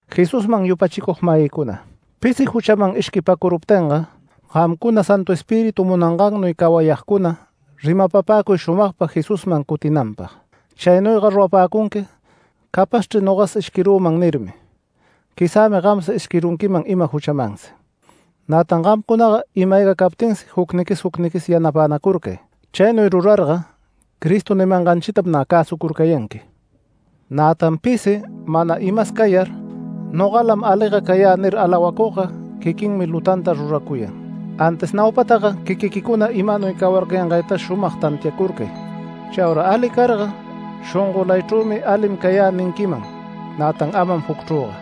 Jesusman yupachicug-mayïcuna, pisi juchaman ishquipäcuruptinga, gamcuna Santu Espíritu munangannuy cawayagcuna rimapapäcuy shumagpa Jesusman cutinanpag. Chaynuyga rurapäcunqui “Capazchri nogas ishquirüman” nirmi. Quizämi gamsi ishquirunquiman ima juchamansi. Nätan gamcunaga ima-ayga captinsi jucniquis jucniquis yanapänacurcay. Chaynuy rurarga Cristo nimanganchitam nä cäsucurcayanqui. Nätan pisi mana imas cayar “Nogalam aliga cayä” nir alawacugga, quiquinmi lutanta ruracuyan. Antis naupataga quiquiquicuna imanuy cawarcayangaytas shumag tantiacurcay. Chaura ali carga shongolaychrümi “Alim cayä” ninquiman, nätan amam jucchrüga.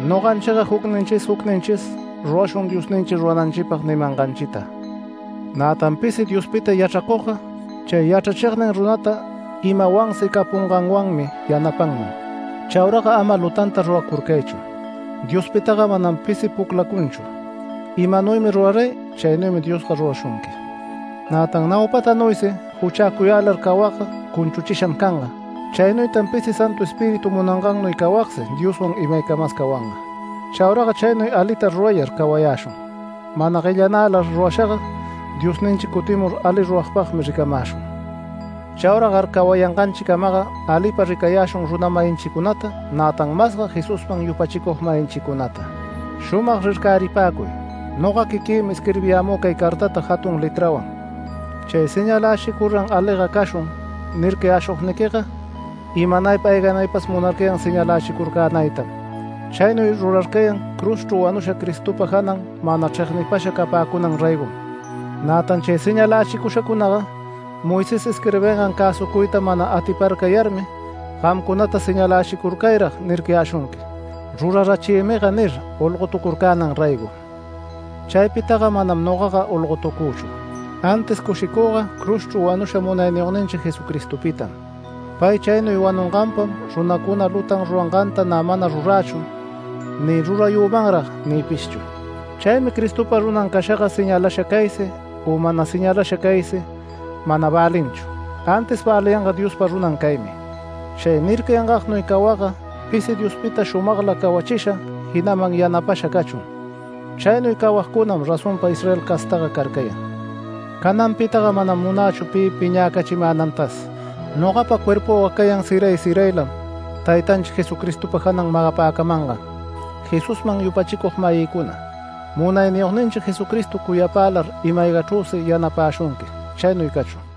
Noganchiga jucninchis jucninchis, rurashun Diosninchi rurananchipag nimanganchita. Nätan pisi Diospita yachracugga, chay yachrachignin runata imawansi capunganwanmi yanapanman. Chauraga ama lutanta ruracurcaychu. Diospitaga manam pisi puclacunchu. Imanuymi ruraray chaynuymi Diosga rurashunqui. Nätan naupatanuysi juchäcuyälar cawagga cunchuchisham canga. Chaynuytan pisi Santu Espíritu munangannuy cawagsi Dioswan imaycamas cawanga. Chauraga chaynuy alita rurayar cawayäshun. Mana guellanälar rurashaga, Diosninchi cutimur ali ruragpagmi ricamäshun. Chauragar cawayanganchicamaga alipa ricayäshun runa-mayinchicunata, nätan masga Jesusman yupachicug-mayinchicunata. Shumag rircäripäcuy, noga quiquïmi isquirbiyämü cay cartata jatun letrawan. Chay “Señalächicur-ran aliga cashun” nircayäshugniquiga, imanaypa ayganaypas munarcayan señalächicurcänaytam. Chaynuy rurarcayan cruzchru wanusha Cristopa janan mana chregnipasha capäcunan raygom. Nätan chay señalächicushacunaga Moisés isquirbingan cäsucuyta mana atiparcayarmi, gamcunata “Señalächicurcayrag” nircayäshunqui, “Rurarachiymiga” nir, olgotucurcänan raygom. Chaypitaga manam nogaga olgotucüchu. Antis cushicüga cruzchru wanusha Munayniyogninchi Jesucristopitam. Pay chaynuy wanunganpam runacuna lutan ruranganta nä mana rurächu, ni rurayümanrag nïpishchu. Chaymi Cristopa runan cashaga señalasha caysi, u mana señalasha caysi mana välinchu. Antis välinga Diospa runan caymi. Chay nircayangagnuy cawagga pisi Diospita shumagla cawachisha, jinaman yanapasha cachun. Chaynuy cawagcunam razonpa Israel castaga carcayan. Cananpitaga manam munächu pi piñäcachimänantas. Nogapa cuerpüga cayan siray siraylam Taytanchi Jesucristopa janan magapäcamangan. Jesusman yupachicug-mayïcuna, Munayniyogninchi Jesucristo cuyapälar ima-aygachrüsi yanapäshunqui. Chaynuy cachun.